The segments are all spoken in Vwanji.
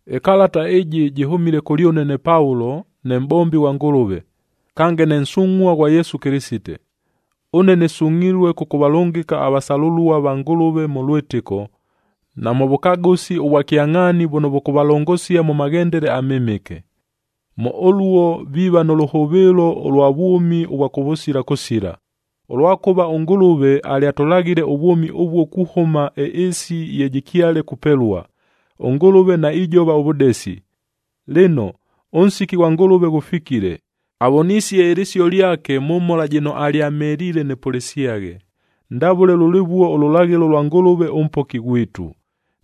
Ɨkalata ɨjɨ jɨhʉmile kʉlyʉne ne Paulo, ne mʼbombi ghwa Ngʉlʉve, kange ne nsungʼhua ghwa Yesu Kɨlɨsite. Ʉne nɨsungʼhilue kʉkʉvalʉngɨka avasalʉlua va Ngʉlʉve mʉ lwɨtɨko, na mʉ vʉkagʉsi ʉvwa kyangʼhaani vʉno vʉkʉvalongosia mʉ maghendele amɨmɨke. Mʉ ʉluo, viiva nʉ lʉhʉvɨɨlo ʉlwa vwʉmi ʉvwa kʉvʉsila kʉsila, ʉlwakʉva ʉNgʉlʉve alyatʉlaghile ʉvwʉmi ʉvuo kuhʉma ɨɨsi ye jɨkyale kupelua, ʉNgʉlʉve naijova ʉvʉdesi. Lɨno, ʉnsiki ghwa Ngʉlʉve ghʉfikile, avonisie ɨlɨsio lyake mʉ mhola jɨno alyamheliile nɨpʉlɨsyaghe, ndavʉle lʉlɨvuo ʉlʉlaghɨlo lwa Ngʉlʉve ʉMpoki ghwitu.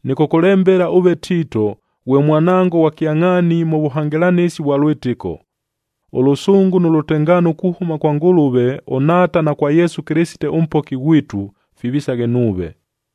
Nɨkʉkʉlembela ʉve Tiito, ghwe mwanango ghwa kyangʼhaani mʉ vʉhangɨlanɨsi vwa lwɨtɨko. Ʉlʉsʉngʉ nʉ lʉtengaano kuhʉma kwa Ngʉlʉve ʉNhaata na kwa Yesu Kɨlɨsite ʉMpoki ghwitu, fivisaghe nuuve.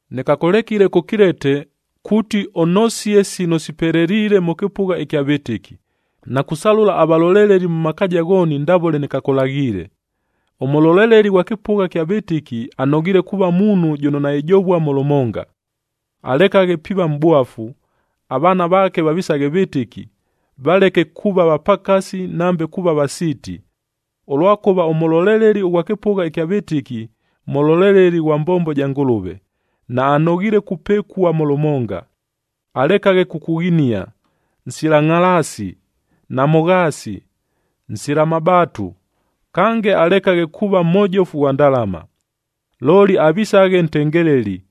Nɨkakʉlekile kʉ Kilete, kuuti ʉnosie sino sipeleliile mʉ kɨpʉgha ɨkya vɨtɨki, na kusalʉla avaloleleli mʉ makaaja ghooni ndavʉle nɨkakʉlaghiile. Ʉmʉloleleli ghwa kɨpʉgha kya vɨtɨki, anoghiile kuuva muunhu jʉno naijovua mʉ lʉmonga. Alekaghe piiva mʼbwafu,a avaana vaake vavisaghe vɨtɨki,b valeke kuuva vapakasi nambe kuuva vasiiti. Ʉlwakʉva ʉmʉloleleli ʉghwa kɨpʉgha ɨkya vɨtɨki, mʉloleleli ghwa mbombo ja Ngʉlʉve, naanoghiile kupɨkua mʉ lʉmonga. Alekaghe kukughinia, nsila ngʼhalaasi, namʉghaasi, nsila mabaatu, kange alekaghe kuuva mhojofu ghwa ndalama. Looli avisaghe ntengeleli,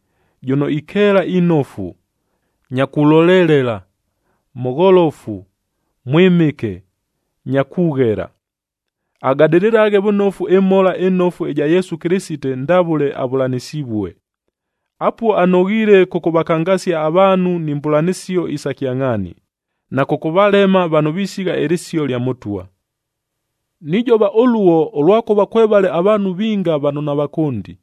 jʉno ikeela inofu, nya kulolelela, mʉgholofu, mwɨmɨke, nya kughela. Agadɨlɨlaghe vʉnofu ɨMhola ɨNofu ɨja Yesu Kɨlɨsite ndavʉle avʉlanɨsivue. Apuo anoghiile kʉkʉvakangasia avaanhu ni mbʉlanɨsio isa kyangʼhaani, na kʉkʉvalema vano visigha ɨlɨsio lya Mʉtwa. Nijova ʉluo, ʉlwakʉva kwevale avaanhu vinga vano navakʉndi,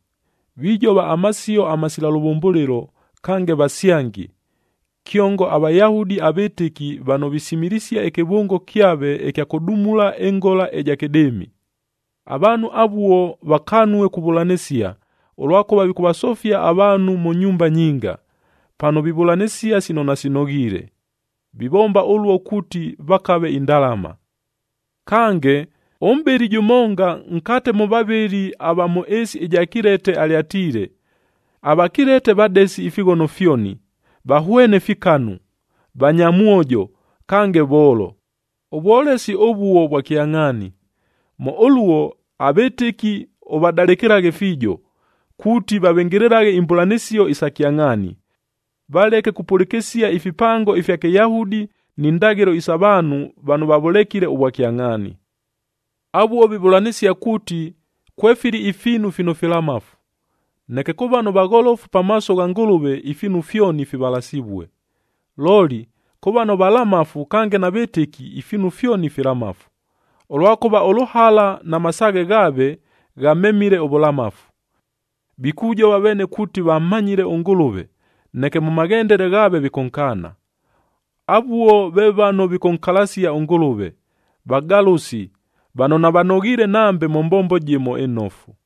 vijova amasio amasila lʉvʉmbʉlɨlo, kange vasyangi, kyongo aVayahudi avɨtɨki vano visimilisia ɨkɨvʉngo kyave ɨkya kʉdumula ɨngola ɨja kɨdɨɨmi. Avaanhu avuo vakanue kuvʉlanɨsia, ʉlwakʉva vikʉvasofia avaanhu mʉ nyumba nyinga, pano vivʉlanɨsia sino nasinoghiile. Vivomba ʉluo kuuti vakave indalama. Kange, ʉmʼbɨli jʉmonga nkate mʉ vavɨli ava mʉ ɨɨsi ɨja Kilete, alyatiile, “AVakilete vadesi ifighono fyoni, vahwene fikanu, vanyamwojo, kange voolo.” Ʉvwolesi ʉvuo vwa kyangʼhaani. Mʉ ʉluo, avɨtɨki ʉvadalɨkɨlaghe fiijo, kuuti vavɨngɨlɨlaghe imbʉlanɨsio isa kyangʼhaani. Valeke kupʉlɨkɨsia ifipango ifya Kɨyahudi ni ndaghɨlo sa vaanhu vano vavʉlekile ʉvwakyangʼhaani. Avuo vivʉlanɨsia kuuti, kwefili ifiinu fino filamafu. Neke kʉ vano vagholofu pamaaso gha Ngʉlʉve ifiinu fyoni fivalasivue. Looli, kʉ vano valamafu kange navɨtɨki, ifiinu fyoni filamafu, ʉlwakʉva ʉlʉhala na masaaghe ghaave, ghamemile ʉvʉlamafu. Vikujova veene kuuti vammanyile ʉNgʉlʉve, neke mʉ maghendele ghaave vikʉnkaana. Avuo ve vano vikʉnkalasia ʉNgʉlʉve, vagalʉsi, vano navanoghiile nambe mʉ mbombo jɨmo ɨnofu.